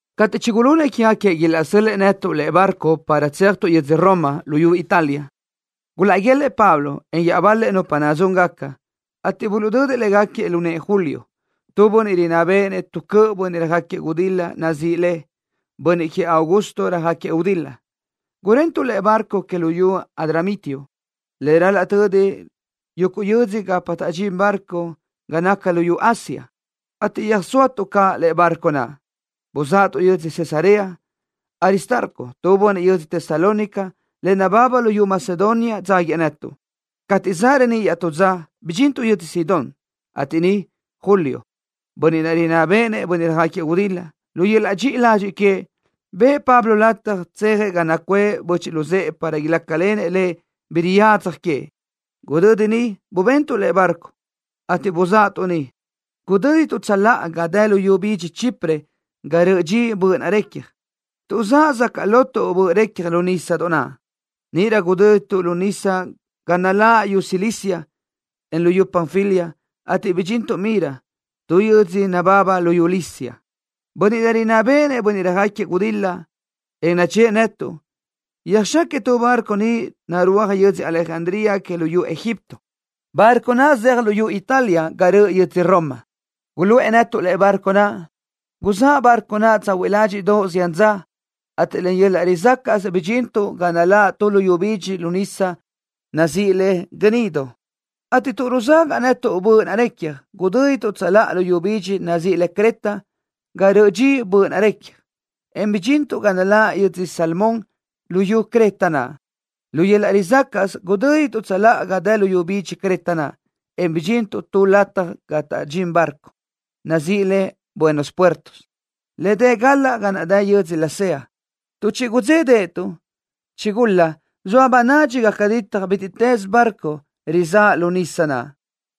Cateʼ chigulunëʼ quégaquiëʼ ilaʼsö́l-lëʼë netuʼ lëʼe barco para tséajtuʼ yödzö Roma, luyú Italia, gulaʼguélëʼë Pablo, en iaʼbal-lëʼ nupa nadzúngaca, ateʼ buluʼdödëʼ légaquiëʼ lu nëʼë Julio, tu bönniʼ rinná béʼenëʼ tu cöʼ bönniʼ röjáquiëʼ gudil-la nazíʼi le: Bönniʼ Queëʼ Augusto Röjáquiëʼ Gudil-la. Gurentuʼ tu lëʼe barco que luyú Adramitio, le ral-laʼ tödi yuguʼ yödzö gapa taʼdxín barco ga naca luyú Asia, ateʼ yúʼusötuʼ caʼ lëʼe barco naʼ, buzáʼatuʼ yödzö Cesarea. Aristarco, tu bönniʼ yödz Tesalónica, le nababa luyú Macedonia dzáguiëʼ netuʼ. Cateʼ zaʼ reníʼ iaʼtú dza, bidxintuʼ yödzö Sidón, ateʼ niʼ Julio, bönniʼ naʼ rinná béʼenëʼ bönniʼ röjáquiëʼ gudil-la, lu yöl-laʼ dxiʼi ladxiʼ queëʼ, bëʼë Pablo lataj tsejëʼ ga nacuʼë böchiʼ luzë́ʼë para ilácalenëʼ lëʼ bi riyadzaj queëʼ. Gudödi niʼ, bubentuʼ lëʼe barco, ateʼ buzáʼatuʼ niʼ. Gudö́dituʼ tsöláʼa ga dë luyú bidxi Chipre ga röʼö dxi böʼ naʼ recja, tuʼ zaʼ sacaʼ lotuʼ böʼ recja lu nísadoʼ naʼ. Níʼirö gudö́dituʼ lu nísadoʼ ga naláʼ luyú Cilicia, en luyú Panfilia, ateʼ bidxintuʼ Mira, tu yödzö nababa luyú Licia. Bönniʼ naʼ rinná béʼenëʼ bönniʼ röjáquiëʼ gudil-la, en nachë́ʼë netuʼ, yöjxáquiëʼ tu barco niʼ narúaj yödzö Alejandría que luyú Egipto, barco naʼ zeaj luyú Italia ga röʼ yödzö Roma. Guluʼë netuʼ lëʼe barco naʼ. Guzáʼ barco naʼ tsahuiʼ ládxiʼdoʼ zián dza, ateʼ len yöl-laʼ rizácaʼsö bidxintuʼ ga naláʼ tu luyú bidxi lu nísadoʼ naʼ nazíʼi le Gnido, ateʼ tuʼ ruzagaʼ netuʼ böʼ naʼ recja, gudö́dituʼ tsöláʼa luyú bidxi nazíʼi le Creta ga röʼö dxi böʼ naʼ recja, en bidxintuʼ ga naláʼ yödzö Salmón luyú Creta naʼ. Lu yöl-laʼ rizácaʼsö gudö́dituʼ tsöláʼa ga dë luyú bidxi Creta naʼ, en bidxintuʼ tu lataj ga taʼdxín barco, nazíʼi le Buenos Puertos, le dë galaʼ ga naʼ dë yödzö Lasea. Tuʼ chigudzédaʼatuʼ, chigulaʼ zoa bönadxi gaca ditaj bítiʼtës barco rizáʼ lu nísadoʼ naʼ,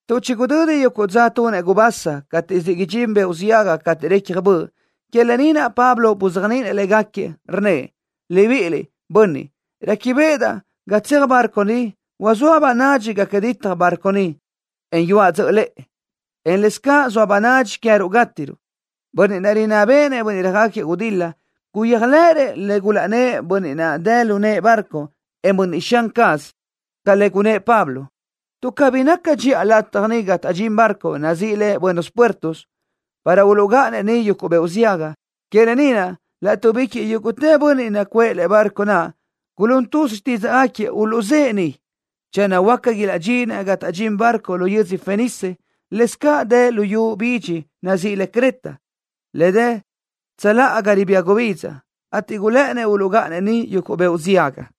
tuʼ chigudödi yuguʼ dza tunëʼ gubasa cateʼ siʼ idxín beoʼ ziaga cateʼ récjadaʼ böʼ. Que lë ni naʼ Pablo buzéajniʼinëʼ légaquiëʼ, rnnëʼ: —Libiʼiliʼ, bönniʼ, réquibeʼedaʼ ga tseaj barco ni, huazóa bönadxi gaca ditaj barco ni, en yuaʼ dzöʼö lëʼe, en lëscaʼ soa bönadxi queë́ruʼ gátiruʼ. Bönniʼ naʼ, rinná béʼenëʼ bönniʼ röjáquiëʼ gudil-la, guyéajlëʼërëʼ le gulaʼnnë́ʼ bönniʼ naʼ dë lu nëʼë barco, en bönniʼ xan caz, ca le gunnë́ʼ Pablo. Tuʼ cabí naca dxiʼa lataj niʼ ga taʼdxín barco, nazíʼi le Buenos Puertos, para uluʼgáʼanëʼ niʼ yuguʼ beoʼ ziaga, que lë ni naʼ laʼtuʼbiquiʼ yúguʼtë bönniʼ nacuʼë lëʼe barco naʼ gulún tuz xtídzaʼgaquiëʼ uluʼzë́ʼë niʼ, channö huáca ilaʼdxinëʼ ga taʼdxín barco lu yödzö Fenice, lëscaʼ dë luyú bidxi naʼ nazíʼi le Creta, le dë tsöláʼa ga ribía gubidza, ateʼ gulë́ʼënnëʼ uluʼgáʼanëʼ niʼ yuguʼ beoʼ ziaga.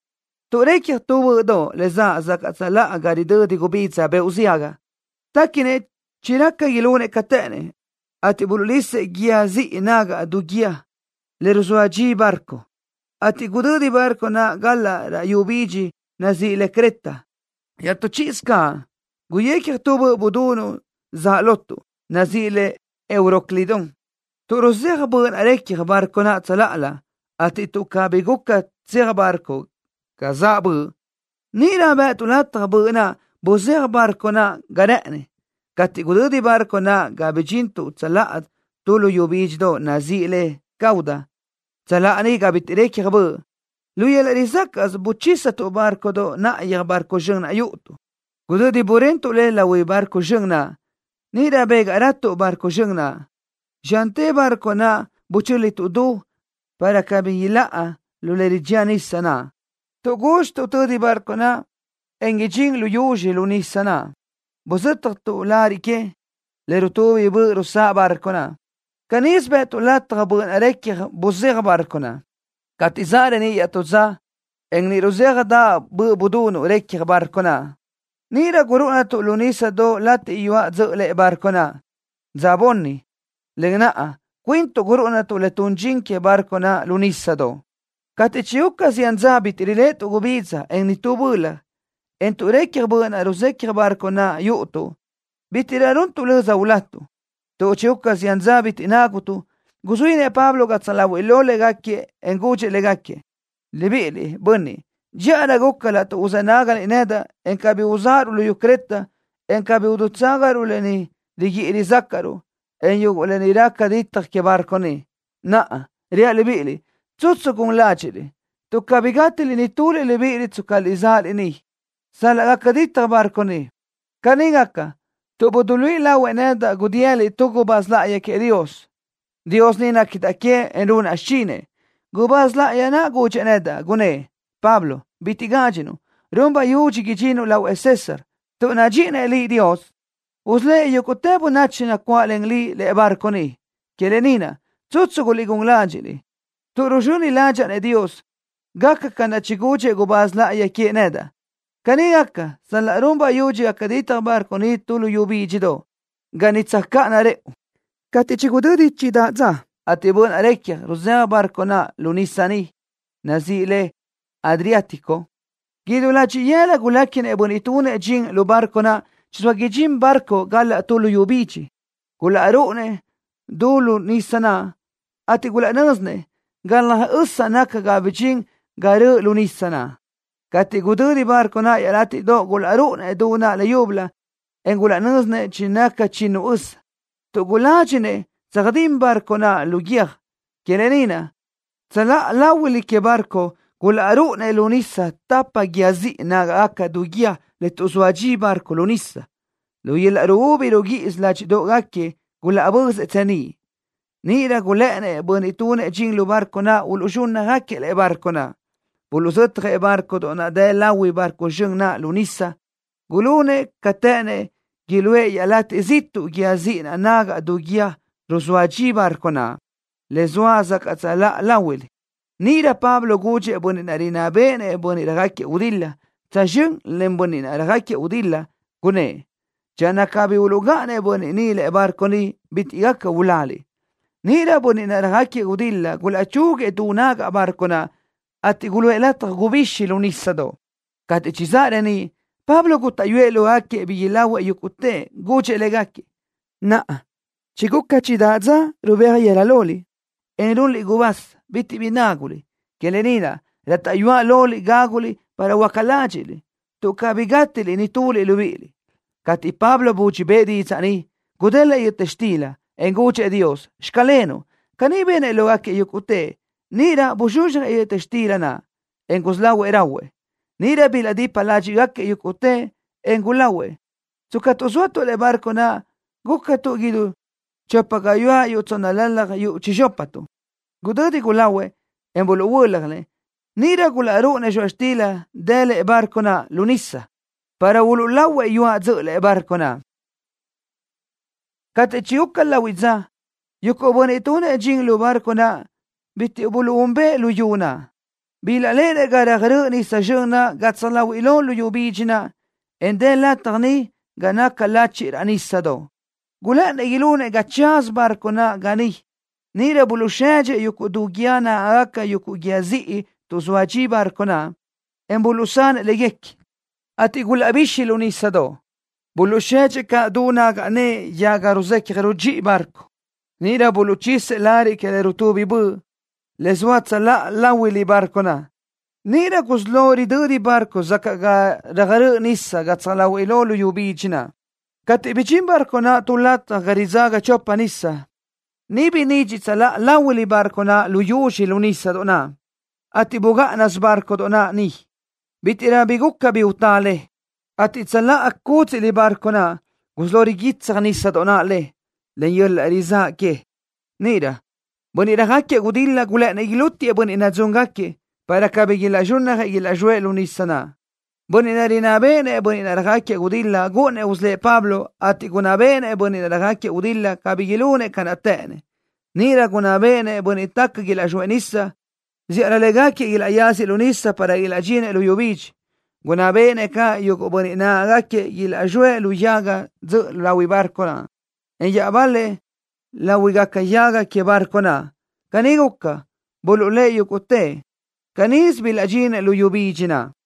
Tuʼ recja tu böʼdoʼ le zaʼ sacaʼ tsöláʼa ga ridödi gubidza beoʼ ziaga, téquinëʼ chiraca ilunëʼ ca të́ʼënnëʼ, ateʼ buluʼlisëʼ guíë ziʼi nagaʼ du guíë le ruzóa dxisö barco, ateʼ gudödi barco naʼ galaʼ raʼ luyú bidxi naʼ nazíʼi le Creta. Iaʼtú chíʼisö caʼ, guyecja tu böʼ budunuʼ zaʼ lotuʼ, nazíʼi le Euroclidón. Tuʼ ruzéaj böʼ naʼ recja barco naʼ tsöláʼalö, ateʼ tuʼ cabí guca tseaj barco ga zaʼ böʼ, níʼirö bë́ʼëtuʼ lataj böʼ naʼ buzéaj barco naʼ ga rë́ʼëni. Cateʼ gudödi barco naʼ ga bidxintuʼ tsöláʼa tu luyú bídxidoʼ nazíʼi le Cauda, tsöláʼa niʼ ga bitiʼ récjadaʼ böʼ, lu yöl-laʼ rizácaʼsö buchísatuʼ bárcodoʼ náʼayöj barco zxön naʼ yúʼutuʼ. Gudödi burentuʼ le lahui barco zxön naʼ, níʼirö bégaʼratuʼ barco zxön naʼ. Zxante barco naʼ buchö́lituʼ du, para cabí iláʼa lu le ridxía nisa naʼ. Tuʼ gúdxituʼ tödi barco naʼ, en inídxiʼ lu yuzxi lu nísadoʼ naʼ, buzö́tjatuʼ lariʼ que, le rutubi böʼ rusáʼ barco naʼ. Canísö bë́ʼëtuʼ lataj böʼ naʼ recja buzéaj barco. Cateʼ zaʼ reníʼ iaʼtú dza, en niʼ ruzéajdaʼ böʼ budunuʼ recja barco naʼ, níʼirö gurúʼunatuʼ lu nísadoʼ latiʼ yuaʼ dzöʼö lëʼe barco naʼ. Dza bunni, len naʼ cuintuʼ gurúʼunatuʼ le tun dxin que barco naʼ lu nísadoʼ. Cateʼ chiguca zián dza bitiʼ riléʼetuʼ gubidza, en nitú bölaj, en tuʼ récjadaʼ böʼ naʼ ruzéaj barco naʼ yúʼutuʼ, bítiʼrö runtuʼ löza ulatuʼ. Tuʼ chiguca zián dza bitiʼ nágutuʼ, guzuínëʼ Pablo gatsaj láhuiʼlö légaquiëʼ, en gudxëʼ légaquiëʼ: —Libiʼiliʼ, bönniʼ, dxíʼarö guca laʼtuʼ uzë́ nágaliʼ nedaʼ, en cabí uzáʼaruʼ luyú Creta, en cabí udutságaruʼ lë ni riguíʼi rizácaʼruʼ, en yuguʼ lë ni raca ditaj que barco ni. Naʼa, reaʼ libíʼiliʼ: Tsutsu guliʼgún ládxiʼliʼ, tuʼ cabí gátiliʼ nituliʼ libíʼiliʼ tscaliʼ zóaliʼ ni, sal-laʼ gaca ditaj barco ni. Caní gaca tuʼ buduluíʼi lahuëʼ nedaʼ gudiyëla tu gubáz láʼayi queëʼ Dios. Dios ni néquidaʼ queëʼ, en runaʼ xichinëʼ. Gubáz láʼayi naʼ gudxëʼ nedaʼ, gunnë́ʼ: “Pablo, bitiʼ gádxinuʼ. Run bayudxi idxinuʼ lahuëʼ César. Tuʼ nadxíʼinëʼ Dios liʼ, usölë́ʼ yúguʼtë bönachi nacuáʼlen liʼ lëʼe barco ni.” Que lë ni naʼ, tsutsu guliʼgún ládxiʼliʼ, tuʼ ruzxöni ládxaʼa-nëʼ Dios, gaca ca naʼ chigudxëʼ gubáz láʼayi queëʼ nedaʼ. Caní gaca sal-laʼ run bayudxi gaca ditaj barco ni tu luyú bídxidoʼ, ga niʼ tsöjcáʼana rëʼu. Cateʼ niʼ chigudödi chidáʼ dza, ateʼ böʼ naʼ recja ruzéaj barco naʼ lu nísadoʼ nazíʼi le Adriático, idú ladxiʼ yëla guléquinëʼ bönniʼ tunëʼ dxin lu barco naʼ chizóa idxín barco galaʼ tu luyú bidxi. Gulaʼrúʼunëʼ du lu nísadoʼ naʼ, ateʼ gulaʼnö́zinëʼ galaj ösa naca ga bidxintë ga rëʼ lu nisa. Cateʼ gudödi barco naʼ iaʼlátiʼdoʼ, gulaʼrúʼunëʼ du naʼ leyúbölö, en gulaʼnö́zinëʼ chinaca chinu ösa. Tuʼ guládxinëʼ tsöjdín barco naʼ lu guiö́j, que lë ni naʼ, tsöláʼa láhuilö que barco gulaʼrúʼunëʼ lu nísadoʼ tapa guíë ziʼi nágaʼgaca du guíë le tuʼzóa dxisö barco lu nisa. Lu yöl-laʼ ruúbi ruguíʼisö ládxiʼdoʼgaquiëʼ gulaʼbözëʼ tseníʼ. Níʼirö gulë́ʼënnëʼ bönniʼ tunëʼ dxin lu barco uluʼzxúnnajëʼ lëʼe barco naʼ. Buluʼzötjëʼ bárcodoʼ naʼ dë lahui barco zxön naʼ lu nísadoʼ. Gulunëʼ ca të́ʼënnëʼ iluʼë iaʼlatiʼ ziʼtuʼ guíë ziʼi naʼ nagaʼ du guíë le ruzóa dxisö barco naʼ, le zoa sacaʼ tsöláʼa láhuilö. Níʼirö Pablo gudxëʼ bönniʼ naʼ rinná béʼenëʼ bönniʼ röjáquiëʼ gudil-la, tsözxö́n len bönniʼ naʼ röjáquiëʼ gudil-la, gunnë́ʼ: —Channö cabí uluʼgáʼanëʼ bönniʼ ni lëʼe barco ni, bitiʼ gaca uláliʼ. Níʼirö bönniʼ naʼ röjáquiëʼ gudil-la gulaʼchúguiëʼ du nagaʼ bárcodoʼ naʼ, ateʼ guluʼë lataj gubixi lu nísadoʼ. Cateʼ chizáʼ reníʼ, Pablo gútaʼyuëʼ lógaquiëʼ bi ilahuëʼ yúguʼtëʼ. Gudxëʼ légaquiëʼ: —Naʼa chiguca chidáʼ dza rubéaj yëla loliʼ, en runliʼ gubasa, bitiʼ bi náguliʼ. Que lë ni naʼ, rátaʼyuaʼ loliʼ gáguliʼ para huöáca ládxiʼliʼ, tuʼ cabí gátiliʼ nituliʼ libíʼiliʼ. Cateʼ Pablo budxi bëʼë didzaʼ ni, gudélëʼë yöta xtila, en gudxëʼ Dios: “Xclenuʼ.” Caní benëʼ lógaquiëʼ yúguʼtëʼ. Níʼirö buzxuzxjëʼ yöta xtila naʼ, en gusí lahuëʼ rahuëʼ. Níʼirö bilaʼdipa ládxiʼgaquiëʼ yúguʼtëʼ, en gulahuëʼ. Tscatuʼ zóatuʼ lëʼe barco naʼ, gúcatuʼ idú chopa gayuáʼ yuʼ tsónnalalaj yuʼ chizxópatuʼ. Gudödi gulahuëʼ, en buluʼhuö́ljanëʼ, níʼirö gulaʼrúʼunëʼ zxoaʼ xtila dë lëʼe barco naʼ lu nisa, para uluʼlahuëʼ yuaʼ dzöʼö lëʼe barco naʼ. Cateʼ chiguca lahuiʼ dza, yuguʼ bönniʼ tunëʼ dxin lu barco naʼ bitiʼ buluʼúnbëʼë luyú naʼ. Bilaʼléʼenëʼ ga röjrö́ʼ nisa zxön naʼ gatsaj láhuiʼlö luyú bidxi naʼ, en dë lataj niʼ ga naca lachiʼ raʼ nísadoʼ. Gulë́ʼënnëʼ ilunëʼ ga tsaza barco naʼ ga niʼ. Níʼirö buluʼsedxëʼ yuguʼ du guíë nágaʼgaca yuguʼ guíë ziʼi tuʼzóa dxisö barco naʼ, en buluʼsanëʼ léguequi, ateʼ gulaʼbixi lu nísadoʼ. Buluʼsedxëʼ caʼ du nagaʼ nëʼe yaga le ruzecaj rudxíʼi barco. Níʼirö buluʼchisëʼ lariʼ que le rutubi böʼ, le zoa tsöláʼa láhuilö barco naʼ, ateʼ níʼirö gusí lo ridödi barco sacaʼ ga röjrö́ʼ nísadoʼ gatsaj láhuiʼlö luyú bidxi naʼ. Cateʼ bidxín barco naʼ tu lataj ga ridzaga chopa nisa, niʼ binidxiʼ tsöláʼa láhuilö barco naʼ lu yuzxi lu nísadoʼ naʼ, ateʼ bugáʼanasö barco naʼ ga niʼ. Bítiʼrö guca bi utá le, ateʼ tsöláʼa cúdziʼlö barco naʼ, gusí lo riguitsaj nísadoʼ naʼ le, len yöl-laʼ rizáʼ que. Níʼirö bönniʼ röjáquiëʼ gudil-la gulë́ʼënnëʼ ilútiëʼ bönniʼ nadzúngaquiëʼ, para cabí ilaʼzxúnnajëʼ, ilaʼzxóëʼ lu nisa naʼ. Bönniʼ naʼ rinná béʼenëʼ bönniʼ naʼ röjáquiëʼ gudil-la gúʼunnëʼ usölë́ʼ Pablo, ateʼ gunná béʼenëʼ bönniʼ naʼ röjáquiëʼ gudil-la cabí ilunëʼ ca naʼ të́ʼënnëʼ. Níʼirö gunná béʼenëʼ bönniʼ taca ilaʼzxóëʼ lu nisa, zíʼalö légaquiëʼ ilaʼyáziëʼ lu nisa para ilaʼdxinëʼ luyú bidxi. Gunná béʼenëʼ caʼ yuguʼ bönniʼ nagáʼanagaquiëʼ ilaʼzxóëʼ lu yaga dzöʼö láhuilö barco, en iaʼbal-lëʼ láhuigaca yágadoʼ que barco naʼ. Caní guca, buluʼlë́ʼ yúguʼtëʼ. Canísö bilaʼdxinëʼ luyú bidxi naʼ.